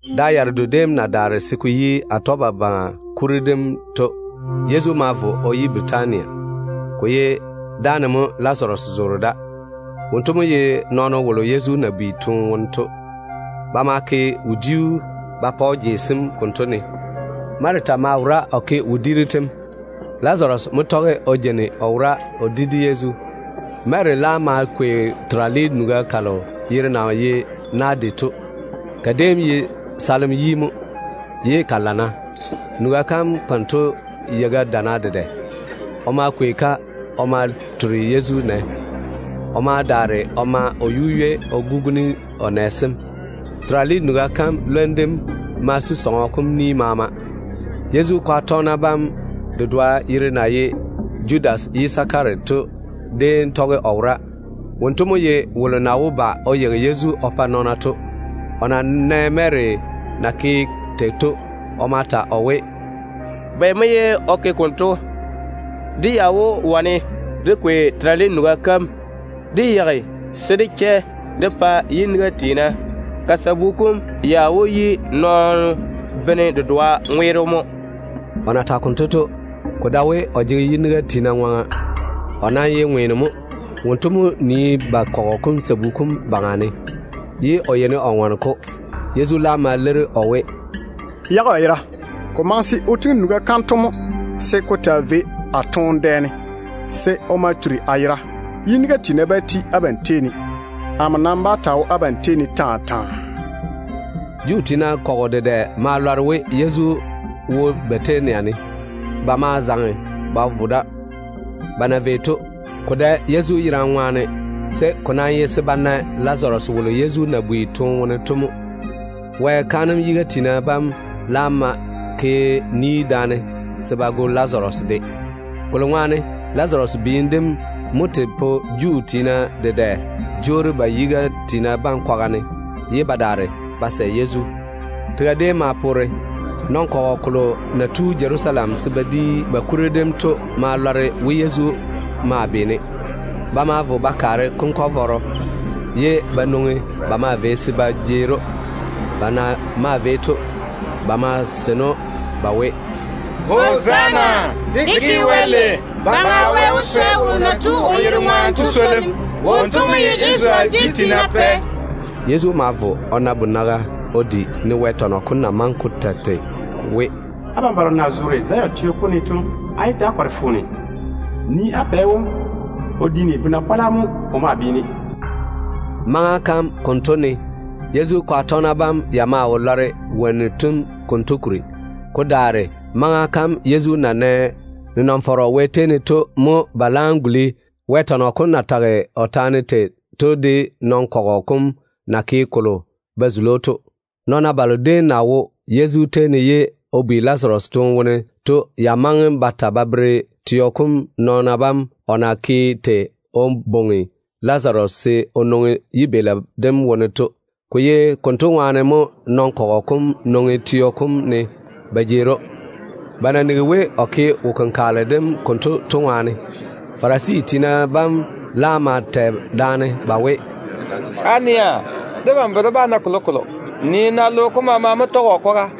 Da yaredo déem na daare se ko yi Atɔgebabaŋa kuri dem to, Yezu ma vo o yi Bɛtania. Ko ye dáane mo Lazaru ya zoora. Wonto mo ye nɔɔno wolo Yezu na bi toone wone to. Ba ma ke wodiu ba pa‑o jei sem konto ne. Marita maa wora o ke wodiiru tem. Lazaru mo tɔge o jeini o wora o di de Yezu. Mary laam ma kwei terale nuga kalo yere na ye ‘Naade’ to. Ka déem ye kunkwolo yi mo, ye ka tiini ka lana. Nuga kam konto yeilo chana dedɛ. O ma kwei-ka o ma turi Yezu nɛ. O ma daare o ma o yu-ywei o guguni o nɛ sem. Terale nuga kam lwom dem ma su sɔŋɔ kom ni maama. Yezu kwaga tɔgena bam dedoa wolo yere na ye Judas Yisakara to de tɔge o wora. Wonto mo ye wolo na wó ba o yeigi Yezu o pa nɔɔna to. O na nɛ Mary na ke tei to, o ma ta o we, “Bɛ mo ye o ke konto? Dé ya wó wane dé kwei terale nuga kam dé yeigi se dé chɛ dé pa yiniga tiina. Ka sabu kom ya wó yi nɔɔno bene dedoa ŋweero mo.” O na tage konto to, ko dae we o jege yiniga tiina ŋwaŋa. O nam ye ŋweeno mo. Wonto mo nii ba kɔgɔ kom sabu kom baŋa ne, ye o yeini o ŋɔne-ko o lea. Yezu laam ma leiri o we, “Yage o yera. Ko maŋe se o tiŋi nuga kanto mo se ko taa vei a toone dɛ ne, se o ma turi a yera. Yiniga tiina bá ti abam tei ne. Amo nam bá taa wo abam tei ne taa taa.” Juu tiina kɔgɔ dedɛ ma lɔre we Yezu wo Bɛtania ne. Ba ma zaŋe ba vo da. Ba na vei to, ko dae Yezu yerane ŋwaane, se ko nam ye se ba na Lazaru wolo Yezu na bi toone wone to mo. Wɛ kaanem yiga tiina bam laam ma ke ni daane se ba go Lazaru de, kolo ŋwaane Lazaru biim dem mo tei pa Juu tiina dedɛ jwoori ba yiga tiina bam kwaga ne, ye ba daare ba sɛ Yezu. Tega déem ma poore. Nɔn-kɔgɔ kolo na tu Jerusalem se ba di ba kuri dem to ma lɔre we Yezu maa beena. Ba ma vo ba kaare konkwara vɔɔro, ye ba nwoŋi ba maa vei se ba jeeri‑o. Ba na maa vei to, ba maa seini‑o ba we: “Hozaana! Dé ke Wɛ lei! Baŋa Wɛ wó swɛ wolo na tu o yere ŋwaane to swolim. Wonto mo ye Isarele dwi tiina bam Pɛ.” Yezu ma vo o na bonaga o di, ne Wɛ tɔnɔ kom na maŋe ko ta tei we, “Abam balo na zoore Zion Zion ye Jerusalem yere dedwoŋi. teo kom ne to, á yé ta‑á kɔre foone. Nii-na á pɛ wom, o diini bona-pɔla mo o maa beena.” Maŋa kam konto ne, Yezu kwaga tɔgena bam ya maa wo lɔre wonnu tem konto kuri. Ko daare maŋa kam Yezu na nɛ nenɔŋ-fɔrɔ Wɛ tei ne to mo ba laam guli Wɛ tɔnɔ kom na tage o taane tei to, de nɔn-kɔgɔ kom na ke kolo ba zuli‑o to. Nɔɔna balo déem na wo Yezu tei ne ye o bi Lazaru toone wone to ya maŋe ba ta ba bere teo kom nɔɔna bam o na ke tei o bwoŋi Lazaru se o nwoŋi yibeeli dem wone to. Ko ye konto ŋwaane mo nɔn-kɔgɔ kom nwoŋi teo kom ne ba jeeri‑o, ba na nigi we o ke wo-kenkagele dem konto to ŋwaane. Farisi tiina bam laam maa tɛ daane ba we, “Á nɛa, debam bere dé bá na kolokolo. Nii-na! Logo kom nɔɔna bam maama mo tɔge o kwaga.”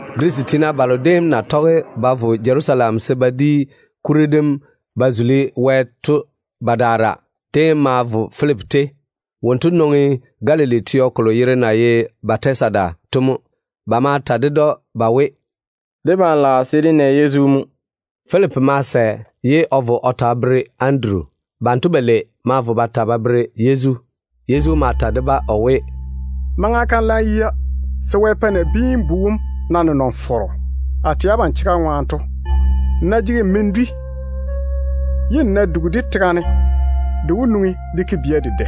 Girisi tiina balo déem na tɔge ba vo Jerusalem se ba di kuri dem ba zuli Wɛ to badaara déem ma vo Filipi tei. Wonto nwoŋi Galili teo kolo yere na ye Bɛtasida to mo. Ba ma ta ded‑o ba we, “Debam lage se dé na Yezu mo.” Filipi ma sɛ ye o vo o ta o bere Anduru. Banto balei ma vo ba ta ba bere Yezu. Yezu ma ta de-ba o we, “Maŋa kam laam yia se Wɛ pa Nabiin-bu wom na nenɔŋ-fɔrɔ. A tɛ abam chega ŋwaane to, nmo ná jege men-bu dedoa se n du, ye n ná dugi-de tega ne, de wó nwoŋi de ke bia dedɛ.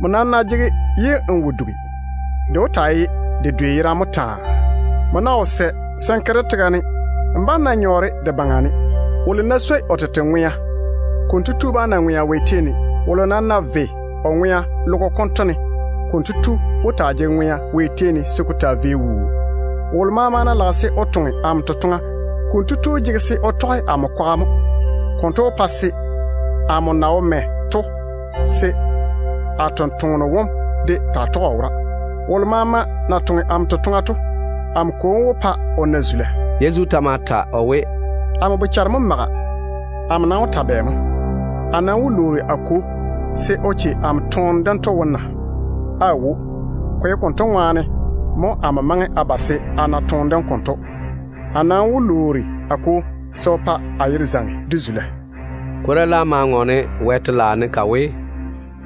Nmo nam ná jege-de ye n wo dugi, de ta wó taa ye de yerane mo taa. Nmo ná wo sɛ se n ke-de tega ne, n bá‑n na nyɔɔre de baŋa ne. Wolo ná swoi o tete ŋwea, konto tu bá na ŋwea Wɛ tei ne. Wolo nam ná ve o ŋwea logo konto ne, kotu wó taa jege ŋwea Wɛ tei ne se ko taa vei wuu. Wolo maama ná lage se o toŋe amo totoŋa, konto tu jege se o tɔge amo kwaga mo. Konto wó pa se amo na wo mɛ to, se a tontoŋeno wom de taa tɔge o wora. Wolo maama ná toŋe amo totoŋa, amo Kwo wó pa kotu na zula.” Yezu ta ma ta o we, “Amo bochare mo maga. Amo nam wó ta bɛ mo? A nam wó lwoori a Kwo se o che amo se a yé zo chanɛɛre dento wone mo na? Aawo. Ko ye konto ŋwaane mo amo maŋe a ba se a na toone dem konto. A nam wó lwoori a Kwo se o pa o yere zaŋe de zula mo.” Kwora laam ma ŋɔɔne Wɛ telaao ne ka we,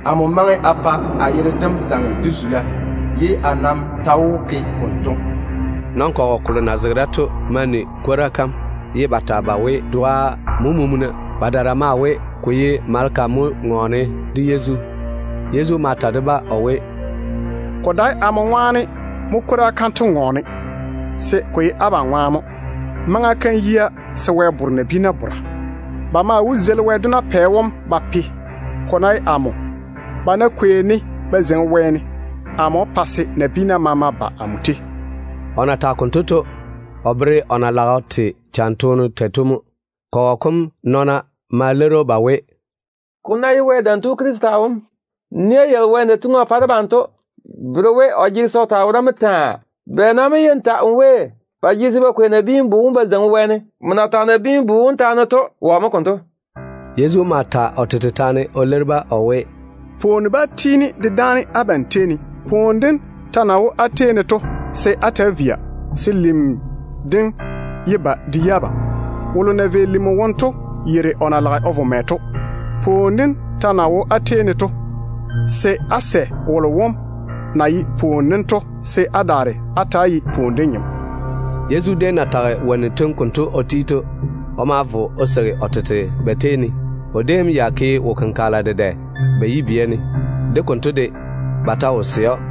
“Amo maŋe a pa a yere dem zaŋe de zula, ye a nam ta wó ke konto.” Nɔn-kɔgɔ kolo na zege da to ma ni kwora kam, ye ba ta ba we, doa mo mumuna. Badaara maa we, ko ye maleka mo ŋɔɔne de Yezu. Yezu ma ta de-ba o we, “Ko dae amo ŋwaane mo kwora kanto ŋɔɔne, se ko ye abam ŋwaane mo. Maŋa kam yia se Wɛ di nabiina taane. Ba maa wó zeili logo baŋa dedɛɛro wom. Ko nam ná ye amo, ba ná kwei-ne ba zeiŋi wɛɛne, amo wó pa se nabiina maama ba amo tei.” O na tage konto to, o bere o na lage o te cham toone tei to mo. Kɔgɔ kom nɔɔna ma leiri‑o ba we, “Ko ná ye Wɛ Dam Tu Krista wom, nia yalo Wɛ na tiŋi o pa debam to bere we o jege se o taa wora mo taa wuu. Bɛ nam mo ye n ta n we, ba jege se ba kwei Nabiin-bu wom ba zeiŋi wɛɛne? Nmo na tage Nabiin-bu wom taane to, wɔ mo konto?” Yezu ma ta o tete taane o leiri-ba o we, “Pwooni bá tiini de dáane abam tei ne. Pwooni dem ta na wo á tei ne to, se á ta‑á via, se lim dem yé ba de yi abam. Wolo na vei lim wone to yeiri o na lage o vo mɛ to. Pwooni dem ta na wo á tei ne to, se á sɛ wolo wom na ye pwooni dem to, se á daare á ta‑á ye pwooni dem bia.” Yezu déem na tage wonnu tem konto o ti to, o ma vo o seigi o tete ba tei ne. O déem ya ke wo-kenkagela dedɛ ba yibia ne. De konto de, ba ta wo sɛ‑o.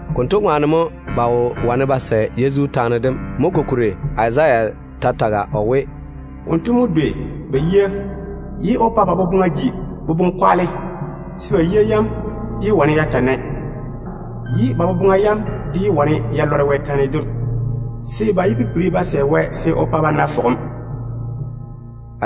Konto ŋwaane mo nɔɔna bam wo wane ba sɛ Yezu taane dem. Kokuri to, Izaya ta tage o we: “Wonto mo dwei ba yia, ye o pa ba boboŋa jei, se ba yia yam yé wane ya taa nae, se ba boboŋa yam de yé wane ya lɔre Wɛ taane dem kuri, se ba yé pipiri ba sɛ Wɛ se o pa ba na fɔgem.”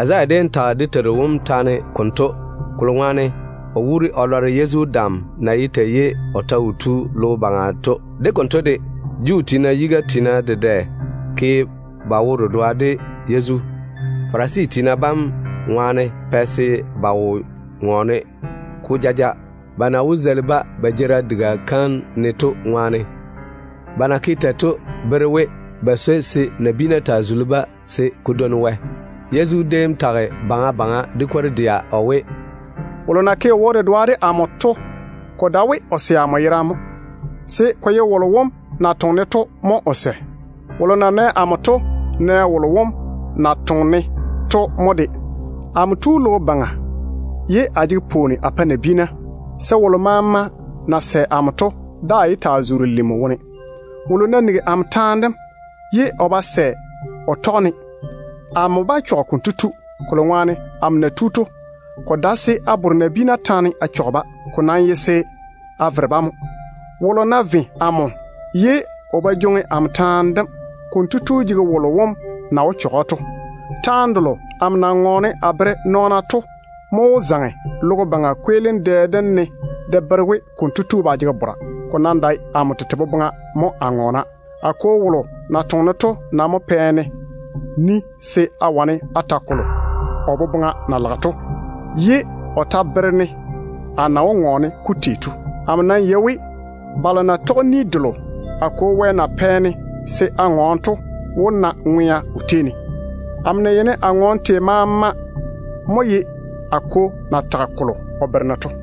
Izaya déem tage dé Teiru wom taane konto, kolo ŋwaane o wuuri o lɔre Yezu nenɔŋ-fɔrɔ kom na ye tei ye o ta wo tu logo baŋa to mo. De konto de, Juu tiina yiga tiina dedɛ ke ba wo-dedoa de Yezu. Ba na kɔre Farisi tiina bam to ŋwaane mo ba wo ŋɔɔne-ko jaja, ba na wó zeili-ba ba jeerim diga kam ne to ŋwaane. Ba na ke tei to bere we, ba swoi se nabiina taa zuli-ba ko dwoi Wɛ wo ná pwoli de-ba. Yezu déem ma ta de kwor-dɛa o we, “Wolo na ke o wo-dedoa de amo to, ko dae we o sɛ amo yerane mo, se ko ye wolo wom na toŋe-ne to de mo o sɛ. Wolo na nɛ amo to nɛ wolo wom na toŋe-ne to mo. Amo tu logo baŋa ye a jege pwooni a pae nabiina, se wolo maama na sɛ amo to daa yé taa zoore lim wone. Wolo ná nigi amo taane dem ye o ba sɛ o toŋe o tɔge-de, amo tete bá chɔge konto tu, kolo ŋwaane amo na tu to, ko dae se a di nabiina taane a chɔge-ba. Ko nam ye se a vere-ba a yage mo. Wolo ná ve amo ye o ba jwoŋi amo taane dem, konto tu jege wolo wom na wó chɔge‑o to. Taane delo amo na ŋɔɔne a bere nɔɔna to mo wó zaŋe logo baŋa kweelim dɛ dem ne de bere we konto tu ba jege bora. Ko nam dae amo tete boboŋa mo a ŋɔɔna. A Kwo wolo na toŋe-ne to nam mo pɛ-ne ni se a wane a ta kwora kalo o boboŋa na lage to, ye o ta bere-ne a na wó ŋɔɔne-ka tei to. Amo nam yei we balo na tɔge ni delo a Kwo Wɛ na pɛ-ne se a ŋɔɔne to wó na ŋwe-doŋa o tei ne. Amo na yeini a ŋɔɔne tei maama mo ye a Kwo na tage kolo o bere-ne to.”